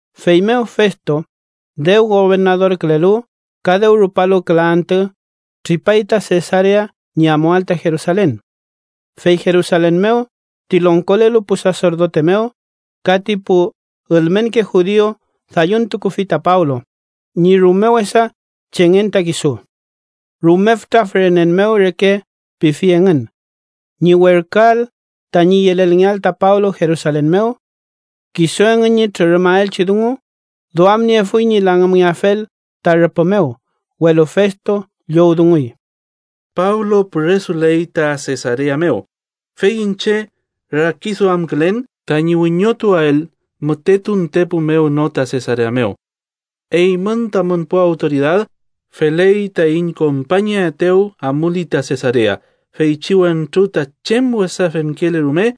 Feymew Festo, dew gobernadorkülelu ka dew rupalu küla antü, tripay ta Sesarea ñi amuael ta Jerusalen. Fey Jerusalen mew ti longkolelu pu saserdote mew ka ti pu ülmenke judiu dalluntukufi ta Pablo ñi rume wesa chengen ta kisu. Rume fütra fürenen mew reke pifi engün, ñi werküael tañi yelelngeael ta Pablo Jerusalen mew. Kisu engün ñi trürümaelchi dungu duamniefuy ñi langümngeafel ta rüpü mew, welu Festo llowdunguy: “Pablo püresuley ta Sesarea mew, fey iñche rakiduamkülen tañi wiñotuael müte tuntepu mew no ta Sesarea mew. Eymün tamün pu awtoridad feley taiñ kompañaetew amuli ta Sesarea. Feychi wentru ta chem wesa femkele rume,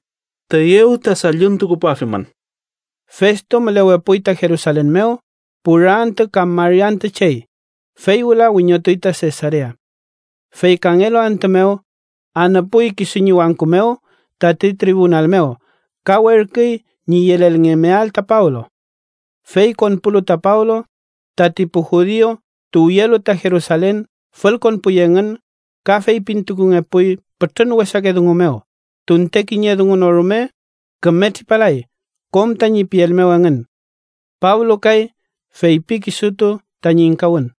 tüyew ta dalluntukupuafimün.” Festo mülewepuy ta Jerusalen mew pura antü kam mari antü chey, fey wüla wiñotuy ta Sesarea. Fey kangelu antü mew anüpuy kisu ñi wangku mew tati tribunal mew ka werküy ñi yelelngemeael ta Pablo. Fey konpulu ta Pablo, tati pu judiu tuwyelu ta Jerusalen fülkonpuy engün ka feypintukungepuy pütrün wesake dungu mew, tunte kiñe dungu no rume küme tripalay kom tañi piel mew engün. Pablo kay feypi kisutu tañi ingkawün: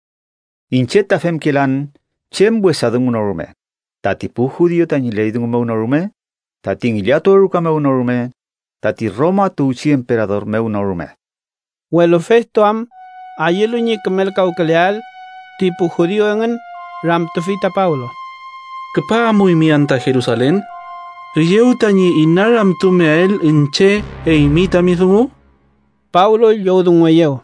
—Iñche ta femkelan chem wesa dungu no rume, tati pu judiu tañi ley dungu mew no rume, tati ngillatuwe ruka mew no rume, tati Roma tuwchi emperador mew no rume. Welu Festo am ayülu ñi kümelkawküleael ti pu judiu engün, ramtufi ta Pablo: —¿Küpa amuymi anta Jerusalen, üyew tañi inaramtumeael iñche eymi tami dungu? Pablo llowdungueyew: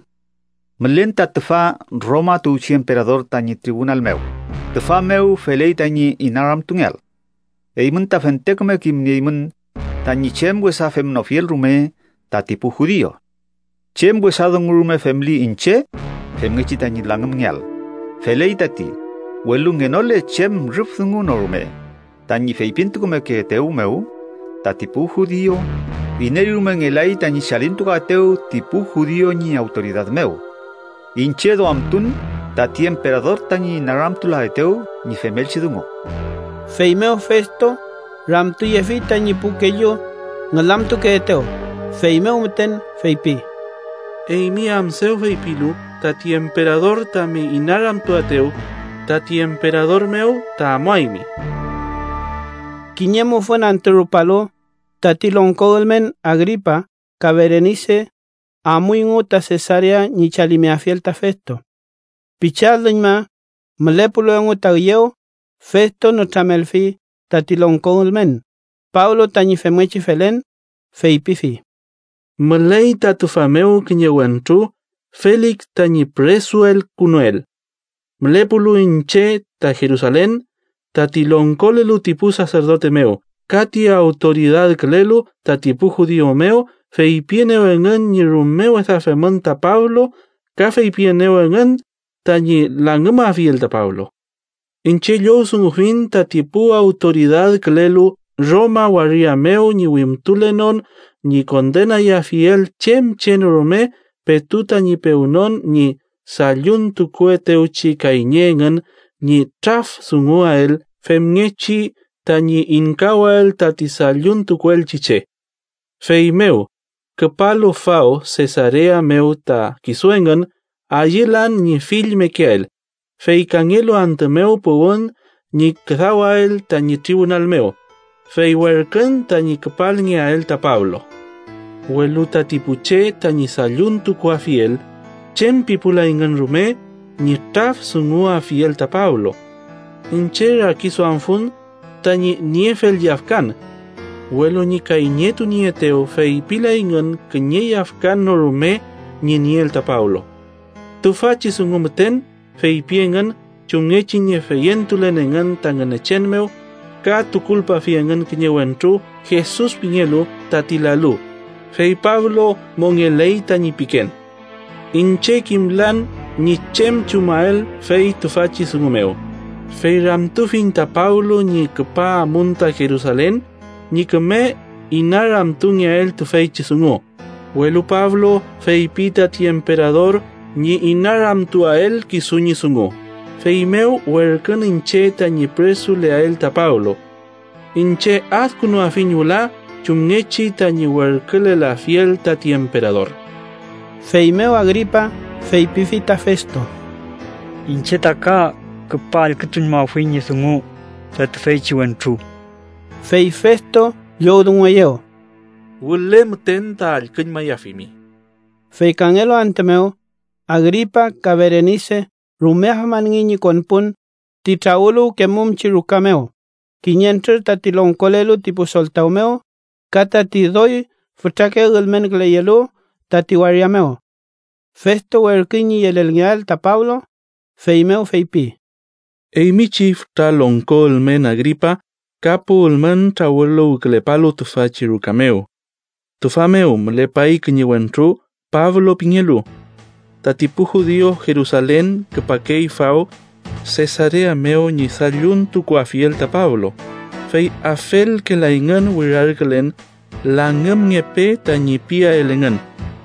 —Mülen ta tüfa Roma tuwchi emperador tañi tribunal mew, tüfa mew feley tañi inaramtungeael. Eymün ta fente küme kimnieymün tañi chem wesa femnofiel rume tati pu judiu. Chem wesa dungu rume femli iñche femngechi tañi langümngeael, feley tati, welu ngenole chem rüf dungu no rume tañi feypintukumekeetew mew tati pu judiu, iney rume ngelay tañi chalintukuaetew ti pu judiu ñi awtoridad mew. Iñche duamtun tati emperador tañi inaramtulaetew ñi femelchi dungu. Feymew Festo ramtuyefi tañi pu kellu ngülamtukeetew, feymew müten feypi: —Eymi am dew feypilu tati emperador tami inaramtuaetew, tati emperador mew ta amuaymi. Kiñe mufün antü rupalu, tati longko ülmen Agripa ka Berenise amuyngu ta Sesarea ñi chalimeafiel ta Festo. Pichi alüñma mülepulu engu ta üyew, Festo nütramelfi tati longko ülmen Pablo tañi femngechi felen. Feypifi: —Müley ta tüfa mew kiñe wentru Felik tañi püresuelkünuel. Mülepulu iñche ta Jerusalen, tati longkolelu ti pu saserdote mew ka ti awtoridadkülelu tati pu judiu mew feypienew engün ñi rume wesa femün ta Pablo ka feypienew engün tañi langümafiel ta Pablo. Iñche llowdungufiñ tati pu awtoridadkülelu Roma waria mew ñi wimtulenon ñi kondenayafiel chem che no rume petu tañi pewnon ñi dalluntukuetewchi kayñe engün ñi traf dunguael femngechi tañi ingkawael tati dalluntukuelchi che. Feymew, küpalu faw Sesarea mew ta kisu engün, ayülan ñi fill mekeael, fey kangelu antü mew puwün ñi küdawael tañi tribunal mew, fey werkün tañi küpalngeael ta Pablo. Welu tati pu che tañi dalluntukuafiel chem pipulayngün rume ñi traf dunguafiel ta Pablo. Iñche rakiduamfun tañi niefel yafkan, welu ñi kayñetunieetew feypilayngün kiñe yafkan no rume ñi nieel ta Pablo. Tüfachi dungu müten feypi engün chumngechi ñi feyentulen engün ta Ngünechen mew, ka tukulpafi engün kiñe wentru Jesus pingelu tati lalu, fey Pablo mongeley tañi piken. Iñche kimlan ñi chem chumael fey tüfachi dungu mew, fey ramtufiñ ta Pablo ñi küpa amun ta Jerusalen ñi küme inaramtungeael tüfeychi dungu. Welu Pablo feypi tati emperador ñi inaramtuael kisu ñi dungu, feymew werkün iñche tañi püresuleael ta Pablo. Iñche adkünuafiñ wüla chumngechi tañi werkülelafiel tati emperador. Feymew Agripa feypifi ta Festo: —Iñche ta ka küpa allkütuñmafuiñ ñi dungu ta tüfeychi wentru. Fey Festo llowdungueyew: —Wüle müten ta allküñmayafimi. Fey kangelu antü mew, Agripa ka Berenise rume afmanngey ñi konpun ti trawüluwkemumchi ruka mew, kiñentrür tati longkolelu ti pu soltaw mew ka tati doy fütrake ülmenküleyelu tati waria mew. Festo werküy ñi yelelngeael ta Pablo, feymew feypi: —Eymi chi fütra longko ülmen Agripa ka pu ülmen trawüluwkülepalu tüfachi ruka mew: tüfa mew mülepay kiñe wentru Pablo pingelu. Tati pu judiu Jerusalen küpakey faw Sesarea mew ñi dalluntukuafiel ta Pablo, fey afelkelayngün wirarkülen ‘langümngepe’ tañi piael engün,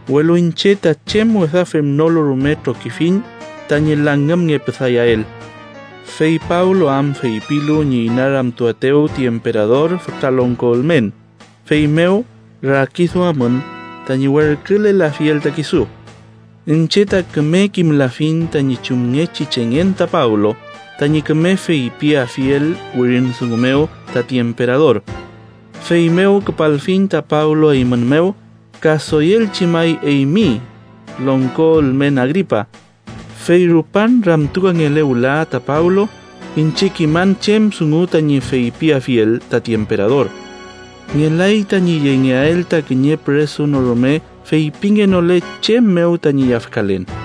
welu iñche ta chem wesa femnolu rume trokifiñ tañi langümngepüdayael. Fey Pablo am feypilu ñi inaramtuaetew ti emperador fütra longko ülmen, feymew rakiduamün tañi werkülelafiel ta kisu. Iñche ta küme kimlafiñ tañi chumngechi chengen ta Pablo tañi küme feypiafiel wirin dungu mew tati emperador. Feymew küpalfiñ ta Pablo eymün mew ka doyelchi may eymi, longko ülmen Agripa, fey rupan ramtukangele wüla ta Pablo, iñche kiman chem dungu tañi feypiafiel tati emperador. Ngelay tañi yengeael ta kiñe püresu no rume feypingenole chem mew tañi yafkalen.